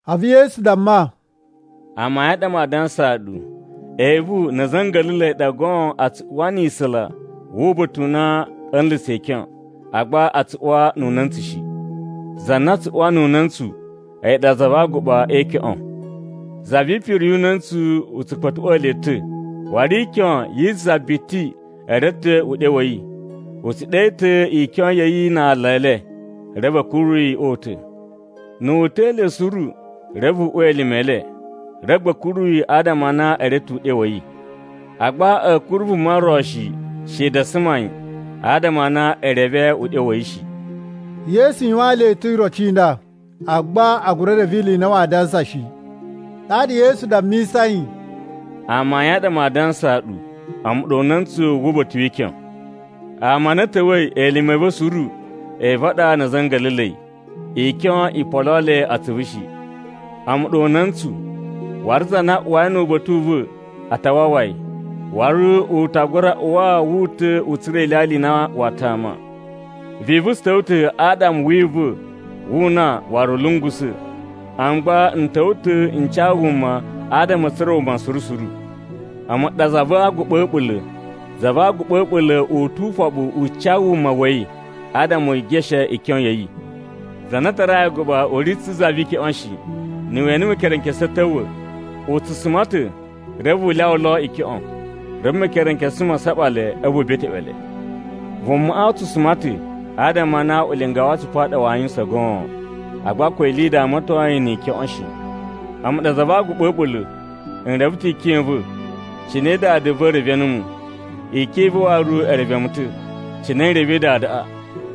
A̱vu Yesu damma, “Amayun a ɗa maa dansaa ɗu, evu na̱ a̱za̱ a̱ nga̱la̱la̱i a ɗa goon a tsu uwa ni isula wu uba̱ta̱ u na a̱ nla̱sa̱ ikyon, agba a tsu uwa nu una̱ntsu shi. Za na tsu uwa nu una̱ntsu a̱yi ɗa za va aguɓa e ikyoꞌon. Za vi ipiri yu una̱ntsu tsu kpa̱tuꞌwa̱a̱ le ta̱. Waru ikyon yi za biti e reve ta̱ uɗyo wa̱ yi. U tsu ɗe ta̱ ikyon ya̱ yi na ala e le reve a̱ kuru yi o uta̱. Na̱ wu uta̱a̱ le suru reve u uwa elime e le, reve gba a̱ kuru yi adama a na e reve ta̱ uɗyo wa̱ yi. Agba a̱a̱ kuru vuma ro shi, shede a suma yi, adama a na e reve uɗyo wa̱ yi shi.” Yesu yuwaan le ta̱ iroci i nda, agba a gura reve ili i na waa dansa shi. Ɗaɗa Yesu dammisai, “Amayun a ɗa maa dansaa ɗu: A̱mu ɗa una̱ntsu wu uba̱ta̱ wi ikyon. Ama a na a̱ ta̱wa̱i elime a̱ va̱ suru evu a ɗa na̱ a̱za̱ a̱ nga̱la̱la̱i. Ikyon i poloo le atsuvu shi. A̱mu ɗa una̱ntsu, waru za na uwai nu uba̱ta̱ u va̱ a ta wawa yi. Waru u ta gura uwa wu uta̱ u tsura̱ anlya a na waa tama. Vivu tsu ta̱wa̱ ta̱ adama wi iva̱ wu una waru u lungusa̱, a̱mu gba n ta̱wa̱ ta̱ n ca wuma adama a̱ tsura̱ wuma suru suru. “A̱mu ɗa za va aguɓa a̱ a̱ɓula̱. Za va aguɓa a̱ a̱ɓula̱ u tu ufoɓu u ca wuma wa̱ yi adama u geshe ikyon ya̱ yi. Za na a tarai aguɓa u ri tsu za vi ikyoꞌon shi. Na̱ we ene mekerenkesu a̱ ta̱wa̱, u tsu suma ta̱ reve u lyawa lo ikyoꞌon. Reve mekerenkesu ma saɓa le a̱vu u beteꞌwe le. Vumaꞌa u tsu suma ta̱ adama a na ulinga wa atsupu a ɗa waa yuwusan goon. Agba ko ili i damaton yi ni ikyoꞌon shi. “A̱mu ɗa za va aguɓa a̱ a̱ɓula̱. N reve ta̱ ikyon i va̱, cine Dada va̱ reve numu. Ikyon i va̱ waru e reve mu ta̱, cine n revei Dadaꞌa.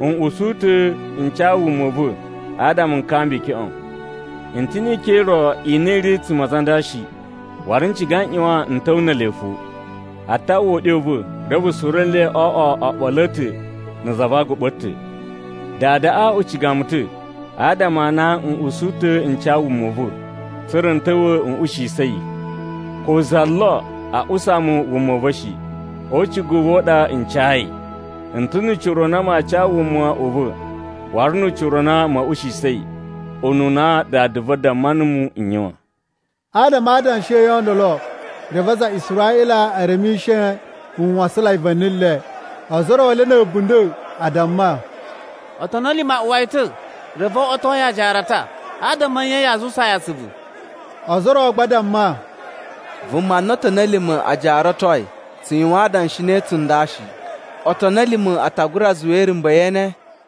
N usu ta̱ n ca wuma u va̱ adama n kamba ikyoꞌon. N ta̱ ni ikyon i ro i na i ri a̱tsuma̱ a aza a nda shi, waru n ciga n ꞌyuwan n ta̱wa̱ ne ele fo. A ta uwwa uɗyo u va̱, reve suru nle o oꞌwo oɓolo a̱ ta̱ na̱ za va aguɓa a̱ ta̱. “Dadaꞌa u ciga mu ta̱ adama a na n usu ta̱ n ca wuma u va̱, tsa̱ra̱ n ta̱wa̱ n ushiyisa̱ yi. Ko za lo a usa mu wuma u va̱ shi. O ucigu u va̱ ɗa n cayi. N ta̱ nu ucira u na maa ca wuma u va̱ waru nu ucira u na ma̱a̱ ushiyisa̱ yi, ununa Dada va̱ damma numu n yuwan.” Adama a adanshi a̱ yi o ndolo, reve aza a Israꞌila e remishe nwasanlai va̱ni le. Ozo o ro le na̱ a̱bunda̱ a damma, “Otoni a̱ lima̱ a uwa yi ta̱, reve o oꞌwoto yi ajaarata. Adama a̱ nye yaa zuwusaa yi atsuvu?” Ozo o ro gba a damma, “Vuma na otoni a̱ lima̱ a jaaratoi tsu yuwan adanshi ne tsunda shi. Otoni a̱ lima̱ a ta gura zuwa irumba̱ ye ene?”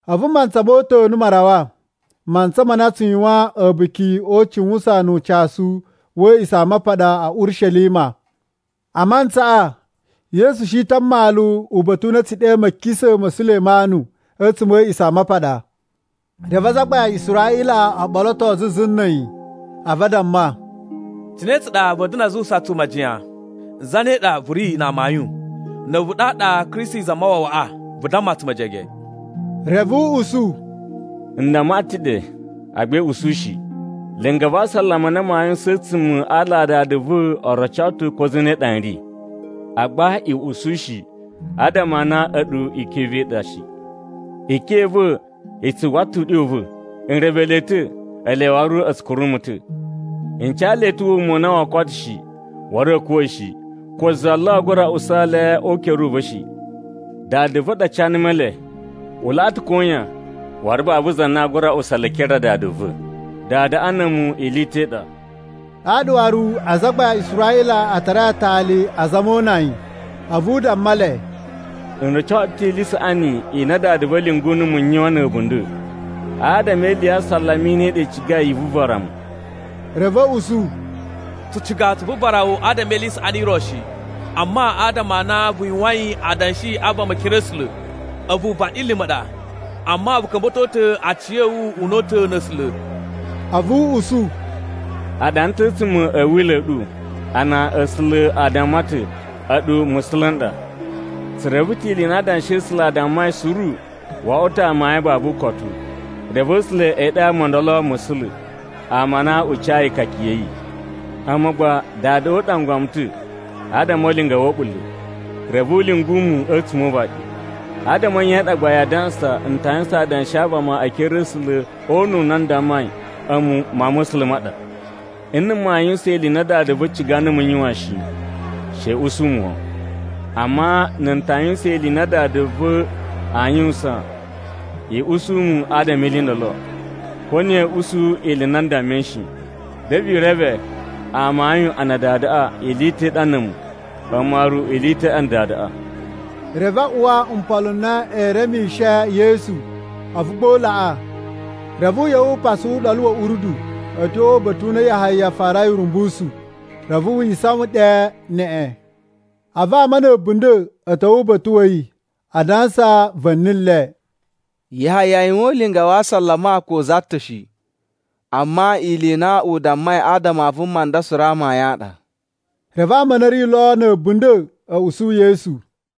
A̱vu mantsa mo uta̱nu ma rawa, mantsa ma na a tsu yuwan A̱buki o Ucuwusan nu Ucasu wa̱ A̱a̱ꞌisamapaɗa a̱ Urishelima. A mantsaꞌa, Yesu shi ta̱ a mmalu uba̱ta̱ u na a̱ tsu ɗe Ma̱kisa̱ ma̱ Sulemanu a̱tsuma̱ a̱ A̱a̱ꞌisamapaɗa. Reve azagbain a Israꞌila o ɓoloto zuzu na̱ a̱yi, a̱vu a damma, “Cine tsa ɗa va̱a̱ da̱na̱ a zuwusa tsu majiyan, zane ɗa vu ri na amayun? Na̱ a̱vu ɗaɗa Kristi Zamawawaꞌa, vu damma tsu mejege.” Reve u usu, “N damma ɗu ta̱ ɗe agba i usu shi. Linga va asalama na maa yuwusan a̱tsuma̱ a ala a Dada va̱ o roco ta̱ ko zane ɗa n ri. Agba i usu shi, adama a na a̱ɗu ikyon i va̱ i ɗa shi. Ikyon i va̱ i tsu uwwa ta̱ uɗyo u va̱. N reve le ta̱, ele waru a̱ tsu kuru mu ta̱. N ca le ta̱ wuma u na woo koto shi, waru a̱a̱ kuwa̱ shi. Ko za lo aa gura usa le o ukere u va̱ shi. Dada va̱ ɗa ca numu ele. U laꞌa ta̱ koyan, waru babu za na aa gura usa le e ekere a Dada va̱. Dadaꞌa na̱ a̱mu ili i ta̱ i ɗa.” Ɗaɗa waru azagbain a Israꞌila a tarai atali azama o una yi. A̱vu u damma le, “N roco ɗu ta̱ ili i saꞌani i na Dada va̱ lyungu numu n yuwan na̱ a̱bunda̱. Adama e ili ya asalama i ne i ɗa i cigai i vuvara mu?” Reve a̱ usu, “Tsu ciga tsu vuvara wu adama e ili i saꞌani i ro shi, amma adama a na vu yuwain adanshi a vama e ekere a̱ A̱sula̱. A̱vu vaɗilima̱ ɗa, amma vu ka̱mba̱to ta̱ aciya̱wu una̱ta̱ na̱ A̱sula̱!” A̱vu u usu, “A ɗana ta̱ a̱tsuma̱ a̱ Wila̱ a̱ ɗu a na A̱sula̱ a damma ta̱, ‘A̱ɗu musula̱ n ɗa.’ Tsu reve ta̱ ili i na Adanshi a̱ A̱sula̱ a dammai suru wo oꞌwo ta̱ amayun babu ukotu. Reve A̱sula̱ e ɗe ama o ndolo musula̱, ama a na u cayi ikaka ya̱ yi. A̱mu gba, Dadaꞌa u ɗangwa mu ta̱ adama o ulinga wa̱ a̱ɓula̱, reve u lyungu mu a̱tsuma̱ o uvaɗi. Adama a̱ nye i ɗa gba yaa dansa n ta yuwusan adanshi a vama e ekere a̱ A̱sula̱ o una̱ u na n dammai, ‘A̱mu Mawun ma̱ A̱sula̱ ma ɗa?’ Nna̱ maa yuwusan ili i na Dada va̱ ciga numu n yuwan shi, she i usu mu wan. Amma na̱ n ta yuwusan ili i na Dada va̱ aa yuwusan, i usu mu adama e ili i ndolo, ko na̱ ya̱a̱ usu ili i na n dammai shi. Reve i reve amayun a na Dadaꞌa ili i ta̱ i ɗa na̱ a̱mu, a̱mu waru ili i ta̱ i ɗa na̱ Dadaꞌa.” Reve a uwa mpolo a na ee remishe Yesu, a̱vu gba u laꞌa. Reve u ꞌya̱wa̱ u pasa Uɗolu wa̱ Urdu a̱ tyo uba̱ta̱ u na Yahaya farai urumbusu, reve wi isawan ɗe neꞌen. A̱vu ama na̱ a̱bunda̱ a̱ ta̱wa̱ uba̱ta̱ wa̱ yi, adansa va̱ni le, “Yahaya yuwan ulinga wa asalama ko za ta̱ shi, amma ili i na u dammai adama a vuma nda suru amayun a ɗa.” Reve ama a na a̱ ri lo na̱ a̱bunda̱ a̱ usu Yesu.